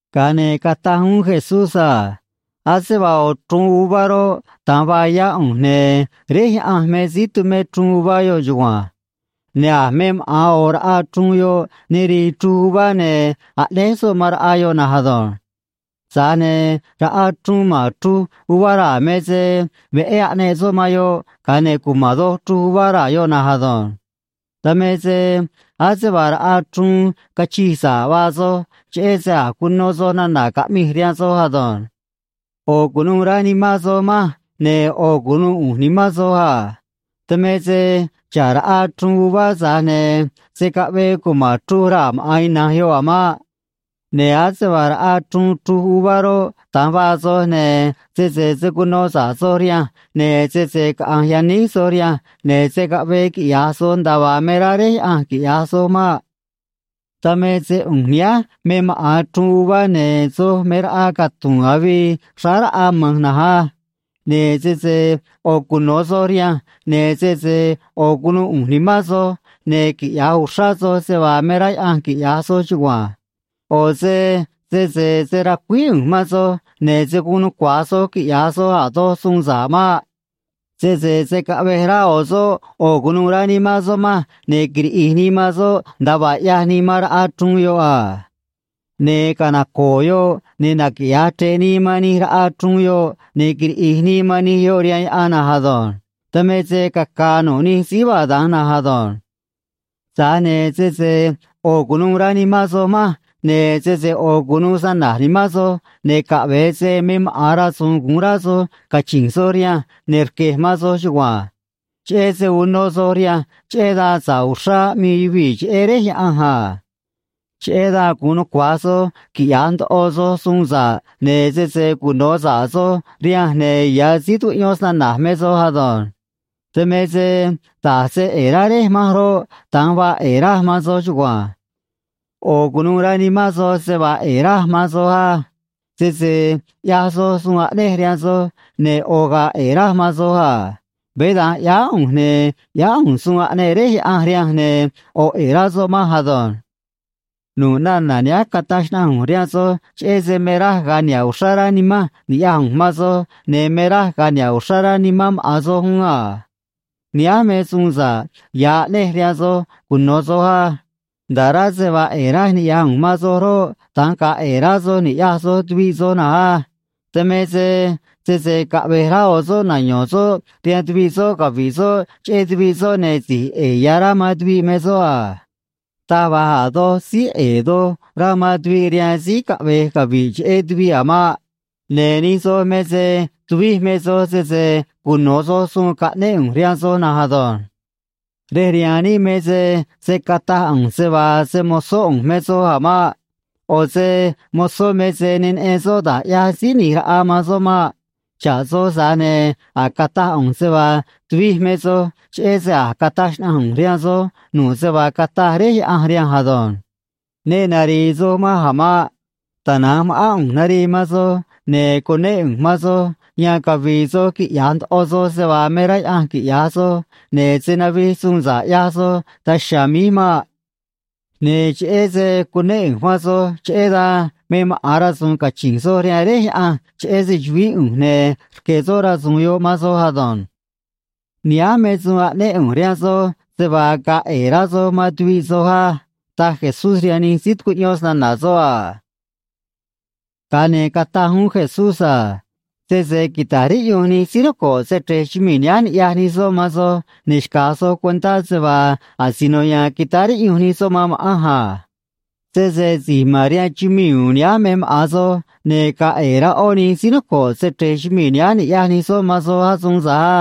Ga̱a ne̱ cataj uún Jesús a: ―Ase vaa ꞌo̱ chruun uvá roꞌ, da̱nj vaa yá ꞌu̱nj, ne̱ Réj Yaꞌanj me síí tumé chruun uvá yoꞌ chugua̱nj. Ne̱ a̱ me maꞌa̱n ꞌo̱ raꞌa chruun yoꞌ ne rii chruj uvá, ne̱ aꞌnéj soꞌ man raꞌa yoꞌ na̱nj ado̱nj. Tza̱j ne̱ raꞌa chruun ma̱n chruj uvá raa̱ me se veꞌé aꞌneꞌ soꞌ man yoꞌ, ga̱a ne̱ cuma̱n doj chruj uvá raa̱ yoꞌ na̱nj ado̱nj. Dan me se ase vaa raꞌa chruun cachij sa̱ꞌ vaa soj, cheꞌé se a̱j cuno soj nana̱ caꞌmij rihaan soj ado̱nj. ꞌO̱ cu̱nuû rá nimán soj manj, ne̱ ꞌo̱ cu̱nuû ꞌu̱nj nimán soj a. Dan me se xa̱ꞌ raꞌa chruun uvá, tza̱j ne̱ se̱ caꞌvee cuma̱n chruj raa̱ maꞌa̱n ina̱nj yoꞌ a̱ maꞌ. Ne̱ ase vaa raꞌa chruun chruj uvá roꞌ, da̱nj vaa soj, ne̱ sese se̱ cuno sa̱ꞌ soj rihanj, ne̱ sese caꞌa̱nj yaníj soj rihanj, ne̱ se̱ caꞌvee quiꞌya̱j soj nda̱a vaa me rá Réj Yaꞌanj quiꞌya̱j soj maꞌ. ’Dan me se ꞌu̱nj nihánj me maꞌa̱n chruun uvá, ne̱ soj me raꞌa catu̱u̱n avii xráá raꞌa ma̱nj na̱nj á. Ne̱ sese ꞌo̱ cuno̱ soj rihanj, ne̱ sese ꞌo̱ cu̱nuû ꞌu̱nj nimán soj, ne̱ quiꞌya̱j uxrá soj se vaa me rá Yaꞌanj quiꞌya̱j soj chugua̱nj. ꞌO̱ se sese se̱ racuíj ꞌu̱nj man soj, ne̱ se̱ guun nucua̱j soj quiꞌya̱j soj a̱ doj suun sa̱ꞌ maꞌ. Sese se̱ caꞌvej rá ꞌo̱ soꞌ ꞌo̱ cu̱nuû rá nimán soꞌ manj, ne̱ quiriꞌi̱j nii man soꞌ, nda̱a vaa ꞌyaj nii man raꞌa chruun yoꞌ a. Ne̱ canaco̱o̱ yoꞌ, ne̱ naquiꞌya̱j chre̱ꞌ nii man nij raꞌa chruun yoꞌ, ne̱ quiriꞌi̱j nii man nij yoꞌ rihaan yaꞌan na̱nj ado̱nj. Dan me se caca̱a̱ nu̱ꞌ nij síí vaa da̱nj na̱nj ado̱nj. ’Tza̱j ne̱ sese ꞌo̱ cu̱nuû rá nimán soj manj, ne̱ sese ꞌo̱ cu̱nuû snana̱j nimán soj, ne̱ caꞌve̱e se me maꞌa̱n rasu̱u̱n gu̱un rá soj cachi̱nj soj rihanj, ne̱ rque̱j man soj chugua̱nj. Cheꞌé se uno soj rihanj, cheꞌé dan sa̱ꞌ uxrá aꞌmii yuvii̱ cheꞌé Réj Yaꞌanj a. Cheꞌé dan gu̱un nucua̱j soj quiꞌya̱j ndoꞌo soj suun sa̱ꞌ, ne̱ sese cuno̱ sa̱ꞌ soj rihanj, ne̱ ya̱ síí tucuꞌyón snana̱j me soj ado̱nj. Dan me se da̱j se ꞌe̱e̱ rá Réj manj roꞌ, da̱nj vaa ꞌe̱e̱ raj man soj chugua̱nj. ꞌO̱ cu̱nuû rá nimán soj se vaa ꞌe̱e̱ raj man soj á. Sese ꞌyaj soj suun aꞌnej rihaan soj, ne̱ ꞌo̱ ga̱a̱ ꞌe̱e̱ raj man soj a. Veé da̱nj ꞌyáá ꞌu̱nj, ne̱ ꞌyáá ꞌu̱nj suun aꞌneꞌ Réj Yaꞌanj rihanj, ne̱ ꞌo̱ ꞌe̱e̱ rá soꞌ manj ado̱nj. ’Nu̱ꞌ nana̱ nihánj cataj xnaꞌanj ꞌu̱nj rihaan soj cheꞌé se me raj ga̱a̱ niha̱ꞌ uxrá rá nimanj ni̱ꞌyaj ꞌu̱nj man soj, ne̱ me raj ga̱a̱ niha̱ꞌ uxrá rá nimán maꞌa̱n soj uún a. Nihánj me suun sa̱ꞌ ya̱ aꞌnej rihaan soj cuno̱ soj á. Nda̱ꞌ rá se vaa ꞌe̱e̱ raj niꞌya̱j ꞌu̱nj man soj roꞌ, da̱nj ga̱a̱ ꞌe̱e̱ rá soj ni̱ꞌyaj soj tuviꞌ soj na̱nj á. Dan me se sese caꞌve̱j rá ꞌo̱ soꞌ nayo̱n soꞌ rihaan tuviꞌ soꞌ cavi̱ꞌ soꞌ cheꞌé tuviꞌ soꞌ, ne̱ si̱j ꞌe̱e̱ ya̱ rá man tuviꞌ me soꞌ a. Taj va̱j a̱ doj síí ꞌe̱e̱ doj rá man tuviꞌ rihaan síí caꞌve̱j cavi̱ꞌ cheꞌé tuviꞌ a̱ maꞌ. Ne̱ nij soj me se tuvij me soj sese cuno̱ soj suun caꞌnéꞌ ꞌu̱nj rihaan soj na̱nj ado̱nj. ’Rej rihaan níꞌ me se se̱ cataj ꞌu̱nj se vaa se‑mo̱zó ꞌu̱nj me soj a̱ maꞌ. ꞌO̱ se mozó me se ne neꞌen soꞌ da̱j ꞌyaj síí ꞌni̱j raꞌa man soꞌ maꞌ. Xa̱ꞌ soj, tza̱j ne̱ a̱j cataj ꞌu̱nj se vaa tuvij me soj, cheꞌé se a̱j cataj xnaꞌanj ꞌu̱nj rihaan soj nu̱ꞌ se vaa cataj Réj Yaꞌanj rihanj ado̱nj. ’Ne nari̱i̱ soj manj a̱ maꞌ. Tana̱nj ma̱ꞌán ꞌu̱nj narii man soj ne̱ cunéꞌ ꞌu̱nj man soj, yan cavi̱i̱ soj quiꞌya̱j ndoꞌo soj se vaa me rá Yaꞌanj quiꞌya̱j soj, ne̱ se̱ navij suun sa̱ꞌ ꞌyaj soj daj chiha̱a̱ míj maꞌ. Ne̱ cheꞌé se cunéꞌ ꞌu̱nj man soj, cheꞌé dan me maꞌa̱n rasu̱u̱n cachi̱nj soj rihaan Réj Yaꞌanj cheꞌé se‑chu̱vií ꞌu̱nj, ne̱ rque̱ soꞌ rasu̱u̱n yoꞌ man soj ado̱nj. ’Nihánj me suun aꞌnéꞌ ꞌu̱nj rihaan soj, se vaa ga̱a̱ ꞌe̱e̱ rá soj man tuviꞌ soj á ―taj Jesús rihaan nij síí tucuꞌyón snana̱ soꞌ a. Ga̱a ne̱ cataj uún Jesús a: ―Sese quita̱j riꞌyunj nij síí noco̱ꞌ se‑chre̱j chumii̱ nihánj ni̱ꞌyaj nij soꞌ man soj, ne̱ xca̱j soj cuentá se vaa asino ya̱a̱n quitáá riꞌyunj nij soꞌ man ma̱ꞌanj a. Sese si̱j ma̱n rihaan chumii̱ u̱u̱n nihánj me maꞌa̱n soj, ne̱ gaa ꞌe̱e̱ rá ꞌó nij síí noco̱ꞌ se‑chre̱j chumii̱ nihánj niꞌya̱j nij soꞌ man soj asuun tza̱j á.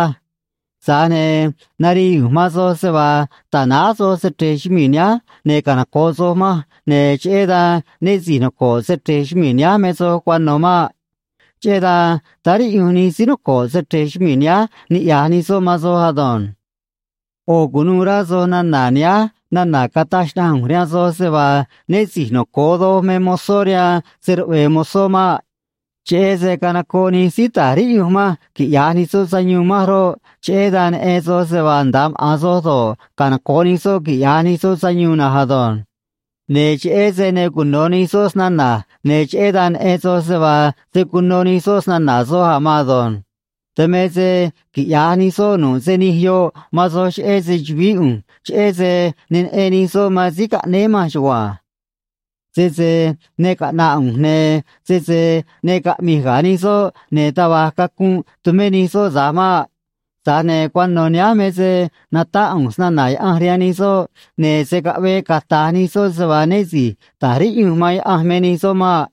Tza̱j ne̱ narii ꞌu̱nj man soj se vaa ta̱náj soj se‑chre̱j chumii̱ nihánj ne̱ canoco̱ꞌ soj manj, ne̱ cheꞌé dan né si̱j noco̱ꞌ se‑chre̱j chumii̱ nihánj me soj cuano̱ maꞌ. Cheꞌé dan táá riꞌyunj nij síí noco̱ꞌ se‑chre̱j chumii̱ nihánj niꞌya̱j nij soꞌ man soj ado̱nj. ’ꞌO̱ cu̱nuû rá soj nana̱ nihánj nana̱ cataj xnaꞌanj ꞌu̱nj rihaan soj se vaa né si̱j noco̱o doj me mozó rihaan se‑ruꞌve̱e̱ mozó maꞌ. Cheꞌé se canocoꞌ nij síí ta̱j riꞌyunj manj quiꞌya̱j nij soꞌ sayuun manj roꞌ, cheꞌé dan neꞌen soj se vaa nda̱a maꞌa̱n soj do̱ꞌ, canoco̱ꞌ nij soꞌ quiꞌya̱j nij soꞌ sayuun na̱nj ado̱nj. Ne̱ cheꞌé se ne cuno̱ nij soꞌ snana̱j, ne̱ cheꞌé dan neꞌen soj se vaa se̱ cuno nij soꞌ snana̱ soj a̱ maan ado̱nj. Dan me se quiꞌya̱j nij soꞌ nu̱ꞌ se nij yoꞌ man soj cheꞌé se‑chu̱vií ꞌu̱nj, cheꞌé se ne neꞌen nij soꞌ man síí caꞌnéé manj chugua̱nj. ’Sese ne caꞌna̱ꞌ ꞌu̱nj, ne̱ sese ne caꞌmi̱j ga̱ nij soꞌ, ne̱ taj va̱j cacunꞌ tumé nij soꞌ tza̱j maꞌ. Tza̱j ne̱ cuano̱ nihánj me se natáꞌ ꞌu̱nj snana̱ Yaꞌanj rihaan nij soꞌ, ne̱ se̱ caꞌvee cata̱j nij soꞌ se vaa né si̱j ta̱j riꞌyunj man Yaꞌanj me nij soꞌ maꞌ.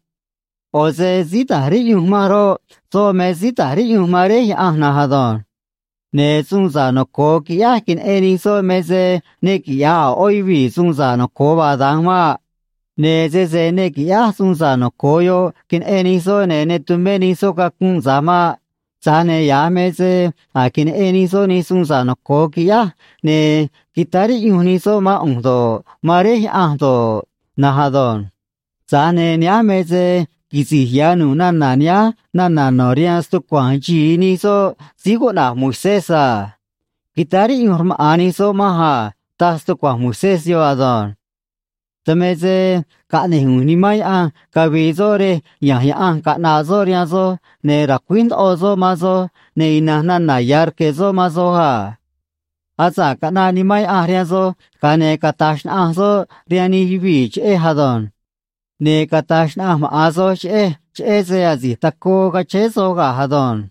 ꞌO̱ se síí ta̱j riꞌyunj manj roꞌ, soꞌ me síí ta̱j riꞌyunj man Réj Yaꞌanj na̱nj ado̱nj. Ne̱ suun sa̱ꞌ noco̱o quiꞌyáj queneꞌen nij soꞌ me se ne quiꞌya̱j a̱ ꞌó yuvii̱ suun sa̱ꞌ noco̱o vaa da̱nj maꞌ. Ne̱ sese ne qui̱ꞌyáj suun sa̱ꞌ noco̱o yoꞌ queneꞌe̱n nij soꞌ, ne̱ ne tumé nij soꞌ cacunꞌ tza̱j maꞌ. Tza̱j ne̱ ya̱j me se a̱j queneꞌen nij soꞌ nij suun sa̱ꞌ noco̱o quiꞌyáj, ne̱ quitáá riꞌyunj nij soꞌ mán ꞌu̱nj do̱ꞌ, man Réj Yaꞌanj do̱ꞌ na̱nj ado̱nj. Tza̱j ne̱ nihánj me se quisi̱j ya̱ nu̱ꞌ nana̱ nihánj nana̱ no̱ rihaan stucua̱nj xi̱i nij soꞌ síí cuꞌna̱j Moisés a: “Quitáá riꞌyunj rmaꞌa̱n nij soꞌ manj a”, taj stucua̱nj Moisés yoꞌ ado̱nj. ’Dan me se caꞌne̱j ꞌu̱nj Nimán Yaꞌanj cavi̱i̱ soꞌ rej ya̱nj Yaꞌanj caꞌna̱ꞌ soꞌ rihaan soj, ne̱ ra̱cuíj ndoꞌo soꞌ man soj, ne̱ ina̱nj nana̱ ya̱ rque̱ soꞌ man soj a. Asa̱ꞌ caꞌnaꞌ Nimán Yaꞌanj rihaan soj, ga̱a ne̱ cata̱j xnaꞌanj soꞌ rihaan nij yuvii̱ cheꞌej ado̱nj. Ne̱ cata̱j xnaꞌanj maꞌa̱n soj cheꞌej, cheꞌé se asi̱j tacoo cachéé soj ga̱j ado̱nj.